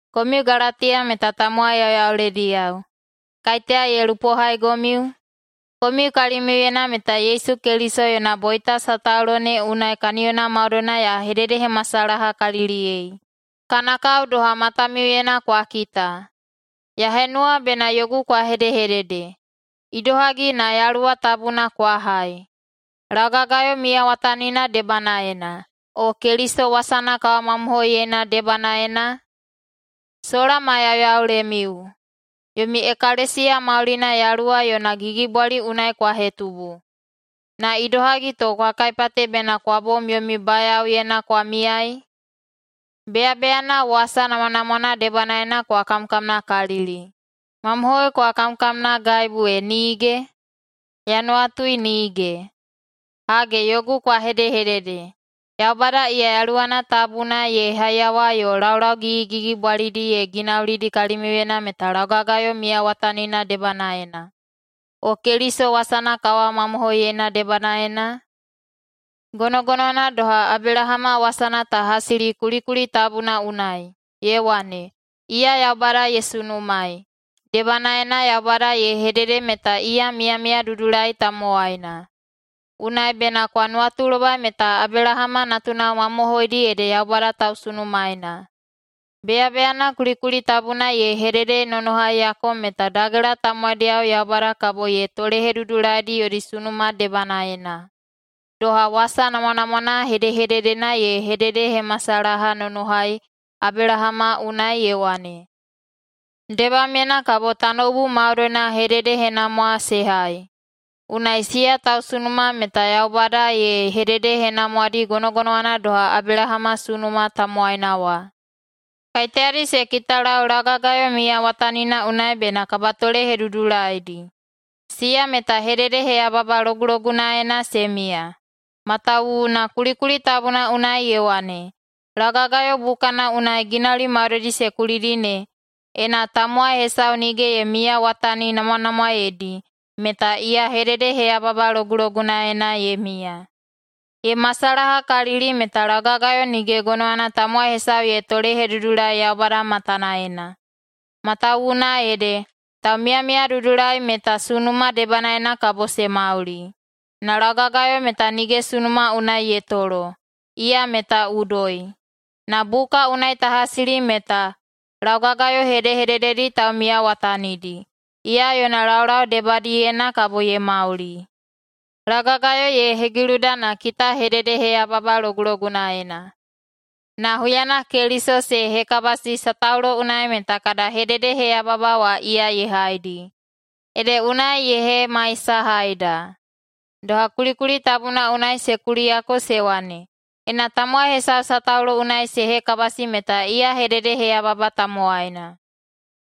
Komiu Galatiya meta tamowai yauyaulediyao. Kaiteya ye lupohaigomiu? Komiu kalimiuyena meta Yesu Keliso yona boita Sataulo ne unai kaniyona maudoina ya hededehemasalahakaliliyei, kana kao doha matamiuyena kwa kita. Ya henuwa bena yogu kwa hedehedede: Idohagi na Yaluwa Tabuna kwa hai, laugagayo miyawatanina debanaena, o Keliso wasana kawamamohoiyeina debanaena? Sola ma yauyaulemiu? Yomi ekalesiya maulina Yaluwa yona gigibwali unai kwa hetubu, na idohagi to kwa kaipate bena kwa bom yomi bayaoyena kwa miyai? Beyabeyana wasa namwanamwana debanaena kwa kamkamnakalili. Mamohoi kwa kamkamnagaibu e nige? Ya nuwatui nige. Hage, yogu kwa hedehedede: Yaubada iya Yaluwana Tabuna ye haiyawa yo laulau gigigigibwalidi ye ginaulidi kalimiuyena meta laugagayo miyawatanina debanaena, o Keliso wasana kawamamohoiyeina debanaena? Gonogonowana doha Abelahama wasana ta hasili kulikuli tabuna unai, ye wane, “Iya Yaubada ye sunumaei, debanaena Yaubada ye hedede meta iya miyamiyadudulai tamowaina.” Unai bena kwa nuwatulobai meta Abelahama natunao mamohoidi ede Yaubada tausunumaena. Beyabeyana kulikuli tabuna ye hededenonohaiyako meta dagela tamowaidiyao Yaubada kabo ye tolehedudulaidi yodi sunuma debanaena, doha wasa namwanamwana hedehededena ye hededehemasalahanonohai Abelahama unai ye wane, “Debamyena kabo tanoubu maudoina hededehenamwa se hai.” Unai siya tausunuma meta Yaubada ye hededehenamwadi gonogonowana doha Abelahama sunuma tamowaina wa. Kaiteyadi se kitalau laugagayo miyawatanina unai bena kabatolehedudulaidi, siya meta hededeheyababa logulogunaena se miya. Matawuwuna kulikuli tabuna unai ye wane, “Laugagayo bukana unai ginauli maudoidi se kulidi ne, ena tamowai hesau nige ye miyawataninamwanamwaeidi, meta iya hededeheyababa logulogunaena ye miya.” Ye masalahakalili meta laugagayo nige gonowana tamowai hesau ye tolehedudulai Yaubada matanaena, matawuwuna ede, “Taumiyamiyadudulai meta sunuma debanaena kabo se mauli.” Na laugagayo meta nige sunuma unai ye tolo, iya meta udoi. Na buka unai ta hasili meta “Laugagayo hedehedededi taumiyawatanidi, iya yona laulau debadiyena kabo ye mauli.” Laugagayo ye hegiluda na kita hededeheyababa logulogunaena. Na huyana Keliso se hekabasi sataulo unai meta kada hededeheyababa wa iya ye haidi, ede unai ye hemaisahaida. Doha kulikuli tabuna unai se kuliyako se wane, “Ena tamowai hesau sataulo unai se hekabasi meta iya hededeheyababa tamowaina.”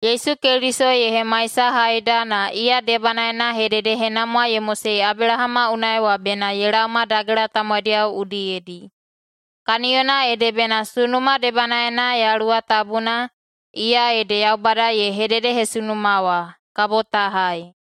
Yesu Keliso ye hemaisahaida na iya debanaena hededehenamwa ye mosei Abelahama unai wa bena ye laoma dagela tamowaidiyao udiyedi. Kaniyona ede bena sunuma debanaena Yaluwa Tabuna, iya ede Yaubada ye hededehesunuma wa, kabo ta hai.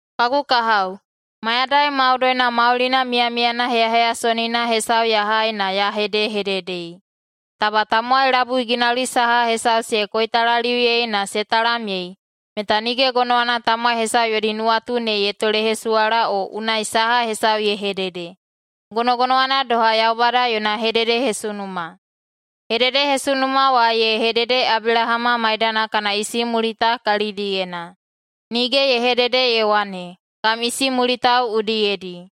Kagu kahao, mayadai maudoina maulina miyamiyana heyaheyasonina hesau ya hai na ya hedehededei: Taba tamowai labui ginauli saha hesau se koitalaliuyei na se talamyei, meta nige gonowana tamowai hesau yodi nuwatu ne ye tolehesuwala o unai saha hesau ye hedede. Gonogonowana doha Yaubada yona hededehesunuma: Hededehesunuma wa ye hedede Abelahama maidana kana isimulita kalidiyena. Nige ye hedede ye wane, “kam isimulitao udiyedi”,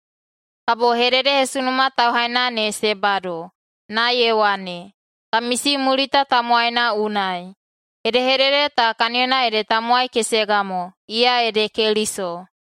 kabo hededehesunuma tauhaina ne se bado, na ye wane, “kam isimulita tamowaina unai”. Hedehedede ta kaniyona ede tamowai kesega mo, iya ede Keliso.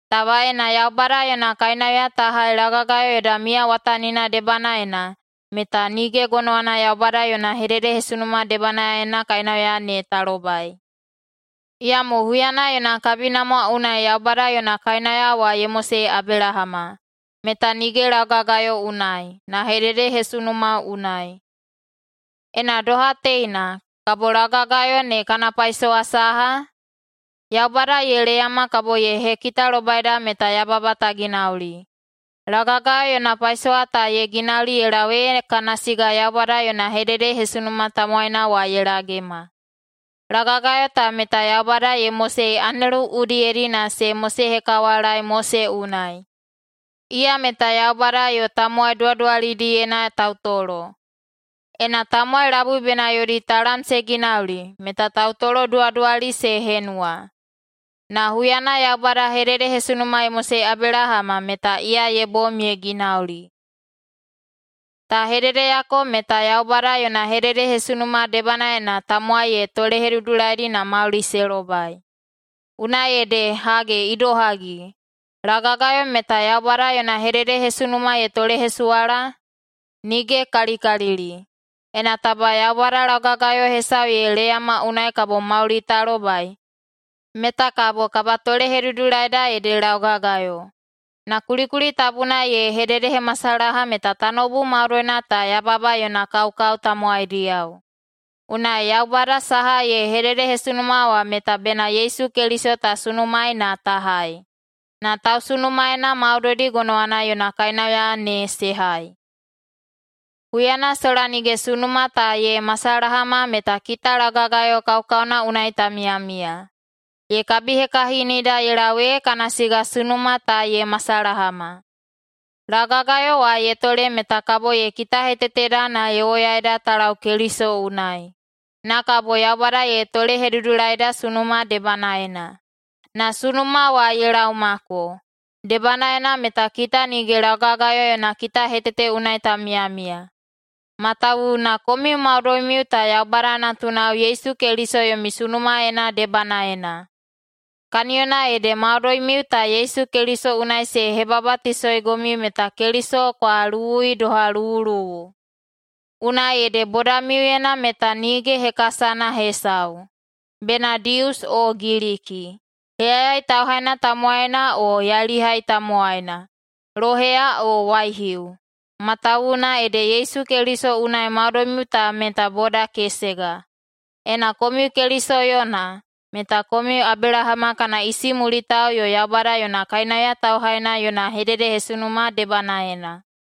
Taba ena Yaubada yona kainauya ta hai laugagayo yoda miyawatanina debanaena, meta nige gonowana Yaubada yona hededehesunuma debanaena kainauya ne ta lobai. Iyamo huyana yona kabinamwa unai Yaubada yona kainauya wa ye mosei Abelahama, meta [nige laugagayo unai, na] hededehesunuma unai. Ena doha teina, kabo laugagayo ne kana paisowa saha? Yaubada ye leyama kabo ye hekitalobaida meta yababa ta ginauli. Laugagayo yona paisowa ta ye ginauli ye lau ee kana siga Yaubada yona hededehesunuma tamowaina wa ye lagema. Laugagayo ta meta Yaubada ye mosei anelu udiyedi na se mosehekawalaei Mose unai, iya meta Yaubada yo tamowai duwaduwalidiyena tautolo. Ena tamowai labui bena yodi talam se ginauli, meta tautoloduwaduwali se henuwa. Na huyana Yaubada hededehesunuma ye mosei Abelahama, meta iya ye bom ye ginauli. Ta hededeyako meta Yaubada yona hededehesunuma debanaena tamowai ye tolehedudulaidi na mauli se lobai. Unai ede hage idohagi, laugagayo meta Yaubada yona hededehesunuma ye tolehesuwala? Nige kalikalili! Ena taba Yaubada laugagayo hesau ye leyama unai kabo mauli ta lobai, meta kabo kabatolehedudulaida ede laugagayo. Na kulikuli tabuna ye hededehemasalaha meta tanoubu maudoina ta yababa yona kaukau tamowaidiyao. Unai Yaubada saha ye hededehesunuma wa meta bena Yesu Keliso ta sunumaei na ta hai, na tausunumaena maudoidi gonowana yona kainauya ne se hai. Huyana sola nige sunuma ta ye masalahama meta kita laugagayo kaukauna unai ta miyamiya. Ye kabihekahinida ye lau ee kana siga sunuma ta ye masalahama. Laugagayo wa ye tole meta kabo ye kitaheteteda na ye woyaida ta lau Keliso unai, na kabo Yaubada ye tolehedudulaida sunuma debanaena. Na sunuma wa ye laomako, debanaena meta kita nige laugagayo yona kitahetete unai ta miyamiya, matawuwuna komiu maudoimiu ta Yaubada natunao Yesu Keliso yomi sunumaena debanaena. Kaniyona ede maudoimiu ta Yesu Keliso unai se hebabatisoigomiu meta Keliso kwa luwui doha luwuluwu. Unai ede bodamiuyena meta nige hekasana hesau, bena Dius o Giliki, heyayai tauhaina tamowaina o yailihai tamowaina, loheya o waihiu, matawuwuna ede Yesu Keliso unai maudoimiu ta meta boda kesega. Ena komiu Keliso yona, meta komiu Abelahama kana isimulitao yo [Yaubada yona] kainauya tauhaina [yona] hededehesunuma debanaena.